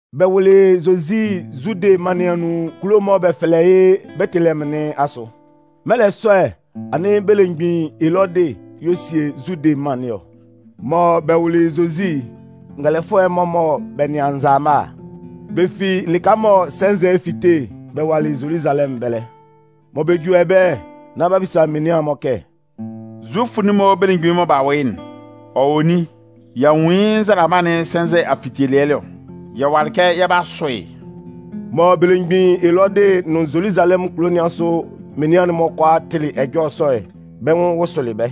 Bɛ wʋlɩ Zozi Zude mân nɩn anun kulo'n mɔ bɛ fɛlɛ yɩ́ Betelehɛmʋn nɩn asʋ. Mɛlɛ sɔ'n, anɩn belemgbin Elɔdɩ y'ɔ sie Zude mân nɩn ɔ. Mɔ bɛ wʋlɩ Zozi'n, ngɛlɛfʋɛ'n-mɔ mɔ bɛ nɩan nzalama'n, bɛ fi lɩka mɔ sɛnzɛ'n fite'n, bɛ walɩ Zoluzalɛmʋn ɛbɛlɛ. Mɔ bɛ juli ɛbɛlɛ'n, nán b'a bisa menian'n-mɔ kɛ: “Zufʋ'n-mɔ belemgbin'n mɔ b'a wʋ yɩ́'n, ɔ wɔ nin? Y'a nwun yɩ́ nzalama'n sɛnzɛ afitelɩɛ ɛlɔ, yɛ walɩ kɛ yɛ 'ba a sʋ yɩ́.” Mɔ belemgbin Elɔdɩ ɔ nʋn Zoluzalɛmʋn kulo nɩn asʋ menian'n-mɔ kʋalaa tɩlɩ ɛjɔlɛ sɔ'n, bɛ́ nwʋn wʋsʋlɩ bɛ́.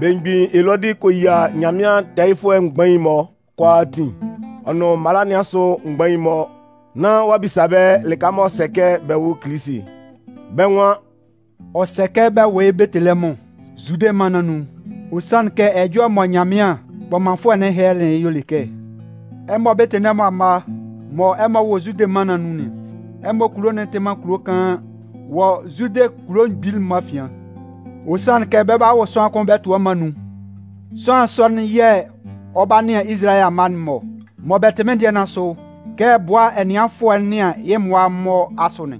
Belemgbin Elɔdɩ kɔ yia Nyanmɩan tɛɛyɩfʋɛ mgbain'n-mɔ kʋalaatin, ɔ nʋn mala nɩn asʋ mgbain'n-mɔ nán ɔ'a bisa bɛ́ lɩka m'ɔ sɛ kɛ bɛ wʋ Kilisi'n. Bɛ́ nwan: “Ɔ sɛ kɛ bɛ wʋ yɩ́ Betelehɛmʋn, Zude mân nɩn anun. Ɔ sanlɩn kɛ ɛjɔlɛ mɔ Nyanmɩan kpɔmanfʋɛ'n hɛlɛlɩ'n y'ɔ le kɛ: Ɛmɔ Betelehɛmʋn amma mɔ ɛmɔ wɔ Zude mân nɩn anun'n, ɛmɔ kulo'n tɩ man kulo kaan wɔ Zude kulo mgbili'n-mɔ afian. Ɔ sanlɩn kɛ bɛ 'ba wʋ sʋanlan kʋn bɛ tʋ ɛmɔ anun. Sʋanlan sɔ'n yɛ̂ ɔ 'ba nɩan Izalayɛ amma'n-mɔ mɔ bɛ tɩ mɩ́n dɩɛ nɩn asʋ kɛ bʋa ɛnɩanfʋɛ nɩan yɩ́ mmʋa'n-mɔ asʋ'n.”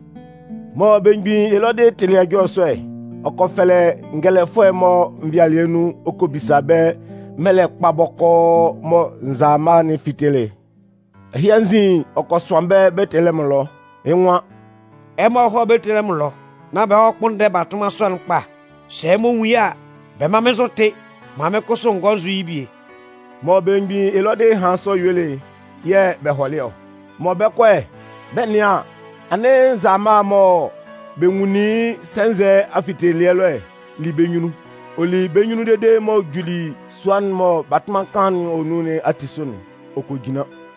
Mɔ belemgbin Elɔdɩ tɩlɩ ɛjɔlɛ sɔ'n, ɔ kɔ fɛlɛ ngɛlɛfʋɛ'n-mɔ nvɩalɩɛ nun ɔ kɔ bisa bɛ́ mɛlɛ kpa bɔkɔɔ mɔ nzalama'n fitelɩ'n. Ɛhɩ anzin, ɔ kɔ sʋan bɛ́ Betelehɛmʋn ɛlɔ, yɩ́ nwan: “Ɛmɔ hɔ́ Betelehɛmʋn ɛlɔ, nán bɛ hɔ́ kpʋ́nndɛ batʋnman sɔ'n kpa. Sɛ ɛmɔ nwun yɩ́ a, bɛ mán mɩ́n nzʋ tɩ́, maan mɩ́n kʋsʋ n gɔ́ n zʋ́ yɩ́ bie.” Mɔ belemgbin Elɔdɩ hanlɩn sɔ helelɩ bɛ́ yuelɩ'n yɛ̂ bɛ hɔlɩ ɔ. Mɔ bɛ 'kɔ'n, bɛ 'nɩan an, anɩn nzalama'n mɔ bɛ nwunlin yɩ́ sɛnzɛ afitelɩɛ ɛlɔ'n li bɛ́ nyunnun. Ɔ li bɛ́ nyunnun dede m'ɔ juli sua'n mɔ batʋnman kaan'n wɔ nun nɩn ati sʋ'n, ɔ kɔ jinlan.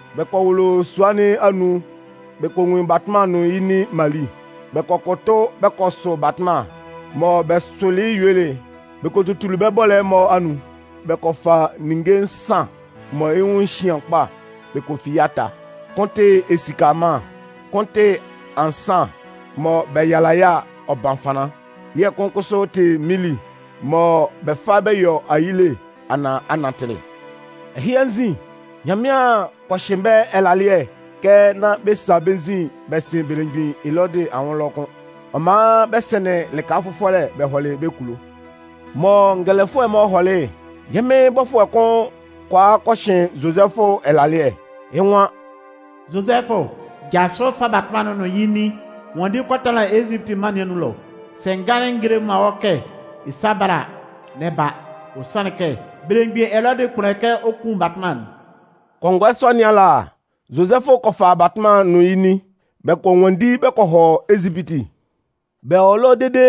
Bɛ kɔ wʋlʋ sua nɩn anun bɛ kɔ nwun batʋnman'n ɔ nʋn yɩ́ nin Mali. Bɛ kɔ kʋtʋ bɛ kɔ sʋ batʋnman'n. Mɔ bɛ sʋlɩ yɩ́ yuelɩ'n, bɛ kɔ tutulu bɛ́ bɔ́lɛ'n-mɔ anun. Bɛ kɔ fa ninnge nsan mɔ yɩ́ nwʋn cian kpa'n bɛ kɔ fi yɩ́ ata. Kʋn tɩ esika ɛmanlan. Kʋn tɩ ansan mɔ bɛ yala yɩ́ a, ɔ ban fanlan. Yɛ̂ kʋn kʋsʋ tɩ minli mɔ bɛ fa bɛ yɔ ayile anaan anatɩlɩ. Ɛhɩ anzin, Nyanmɩan kɔ hɩn bɛ́ ɛlalɩɛ kɛ nán bɛ sa bɛ́ nzin bɛ sɩn belemgbin Elɔdɩ anwʋn ɛlɔ kʋ́n. Ɔ man bɛ sɩnlɩn lɩka fʋfɔlɛ bɛ hɔlɩ bɛ́ kulo. Mɔ ngɛlɛfʋɛ'n-mɔ hɔlɩ'n, yɛ́ Mɩn bɔfʋɛ'n kʋn kɔ a kɔ hɩn Zozɛfʋ ɛlalɩɛ, yɩ́ nwan: “Zozɛfʋ, jasʋ fa batʋnman'n nʋn yɩ́ nin nwanndi kɔ tanlan Ezipiti mân nɩn anun ɛlɔ. Sɛ n ganlɩn n gelelɩ man wɔ́ kɛ ɛ sá bála a, n'ɛ ba. Ɔ sanlɩn kɛ, belemgbin Elɔdɩ 'kpʋnndɛ kɛ ɔ kun batʋnman'n.” Kɔngɔɛ sɔ nɩn ala, Zozɛfʋ kɔ fa batʋnman'n nʋn yɩ́ nin, bɛ kɔ nwanndi bɛ kɔ hɔ Ezipiti. Bɛ wɔ ɛlɔ dede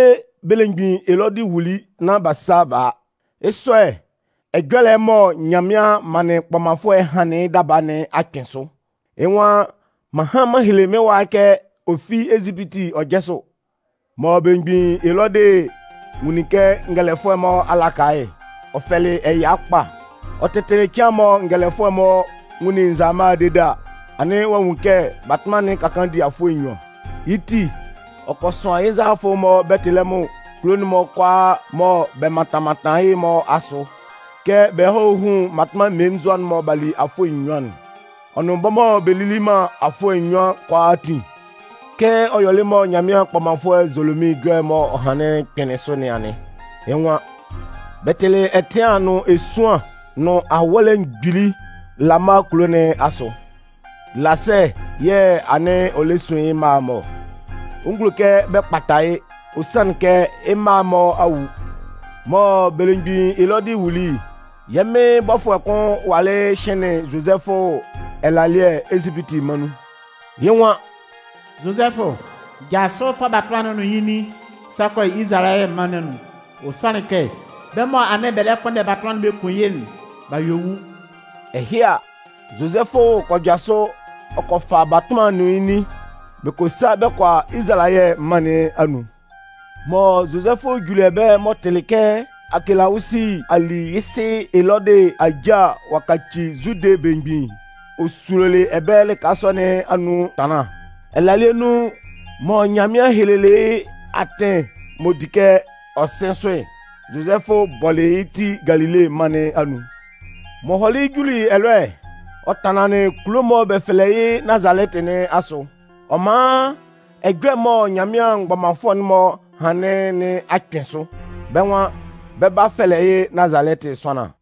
belemgbin Elɔdɩ wuli nán b'a sa b'a a. Yɩ́ sɔ'n, ɛjɔlɛ'n mɔ Nyanmɩan manlɩn kpɔmanfʋɛ'n hanlɩn yɩ́ daba nɩn a kpɩn sʋ. Yɩ́ nwan: M'an han m'an hele mɩ́n wa'n kɛ ɔ fi Ezipiti ɔ jásʋ. Mɔ belemgbin Elɔdɩ nwunlin kɛ ngɛlɛfʋɛ'n-mɔ a laka yɩ́'n, ɔ fɛlɩ ɛya kpa. Ɔ tɩtɩlɩ cɩan'n mɔ ngɛlɛfʋɛ'n-mɔ nwunlin nzalama'n dede a, anɩn ɔ'a nwun kɛ batʋnman'n ka kaan di afʋɛ nnyuan. Yɩ́ ti, ɔ kɔ sʋan yɩ́ nzalafʋ'n-mɔ Betelehɛmʋn nʋn kulo'n-mɔ kʋalaa mɔ bɛ mantan mantan yɩ́'n-mɔ asʋ kɛ bɛ hɔ́ hún mmatʋnman mmelenzua mɔ b'a li afʋɛ nnyuan'n, ɔ nʋn bɛ́ mɔ bɛ lili man afʋɛ nnyuan'n kʋalaatin. Kɛ ɔ yɔlɩ mɔ Nyanmɩan kpɔmanfʋɛ Zolomin ɛjɔlɛ'n m'ɔ hanlɩn'n kpɩnlɩn sʋ nɩn anɩn. Yɩ́ nwan: Bɛ tɩlɩ ɛtɩan nʋn esuan nʋn awɔ́lɛ mgbili Lama kulo nɩn asʋ. Lasɛɛ yɛ̂ anɩn ɔ lɛ sun yɩ́ mma'n-mɔ ɔ. Ɔ ngulo man kɛ bɛ kpata yɩ́, ɔ sanlɩn kɛ yɩ́ mma'n-mɔ a wu. Mɔ belemgbin Elɔdɩ wuli'n, yɛ́ Mɩn bɔfʋɛ'n kʋn walɩ hɩnlɩn Zozɛfʋ ɛlalɩɛ Ezipiti mân nun. Yɩ́ nwan: “Zozɛfʋ, jasʋ fa batʋnman'n nʋn yɩ́ nin sa kɔ Izalayɛ mân nɩn anun. Ɔ sanlɩn kɛ, bɛ́ mɔ anɩn bɛ lɛ kpʋnndɛ batʋnman'n bɛ kun yɩ́'n, b'a yue wu.” Ɛhɩ a, Zozɛfʋ kɔ jasʋ ɔ kɔ fa batʋnman'n nʋn yɩ́ nin, bɛ kɔ sa kɔ hɔ Izalayɛ mân nɩn anun. Mɔ Zozɛfʋ juli ɛbɛlɛ m'ɔ tɩlɩ kɛ Aakelawusi a li yɩ́ sɩ Elɔdɩ aja ɔ'a kaci Zude belemgbin'n, ɔ sulolɩ ɛbɛlɛ lɩka sɔ nɩn anun ɛtanlan. Ɛlalɩɛ nun, mɔ Nyanmɩan helelɩ yɩ́ atɩn m'ɔ di kɛ ɔ sɩn sʋ'n, Zozɛfʋ bɔlɩ yɩ́ ti Galile mân nɩn anun. M'ɔ hɔlɩ juli ɛlɔ'n, ɔ tanlanlɩn kulo'n mɔ bɛ fɛlɛ yɩ́ Nazalɛtɩ nɩn asʋ. Ɔ man ɛjɔlɛ'n mɔ Nyanmɩan mgbɔmanfʋɛ'n-mɔ hanlɩn nɩn a kpɩn sʋ. Bɛ́ nwan: Bɛ 'ba fɛlɛ yɩ́ Nazalɛtɩ sʋanlan.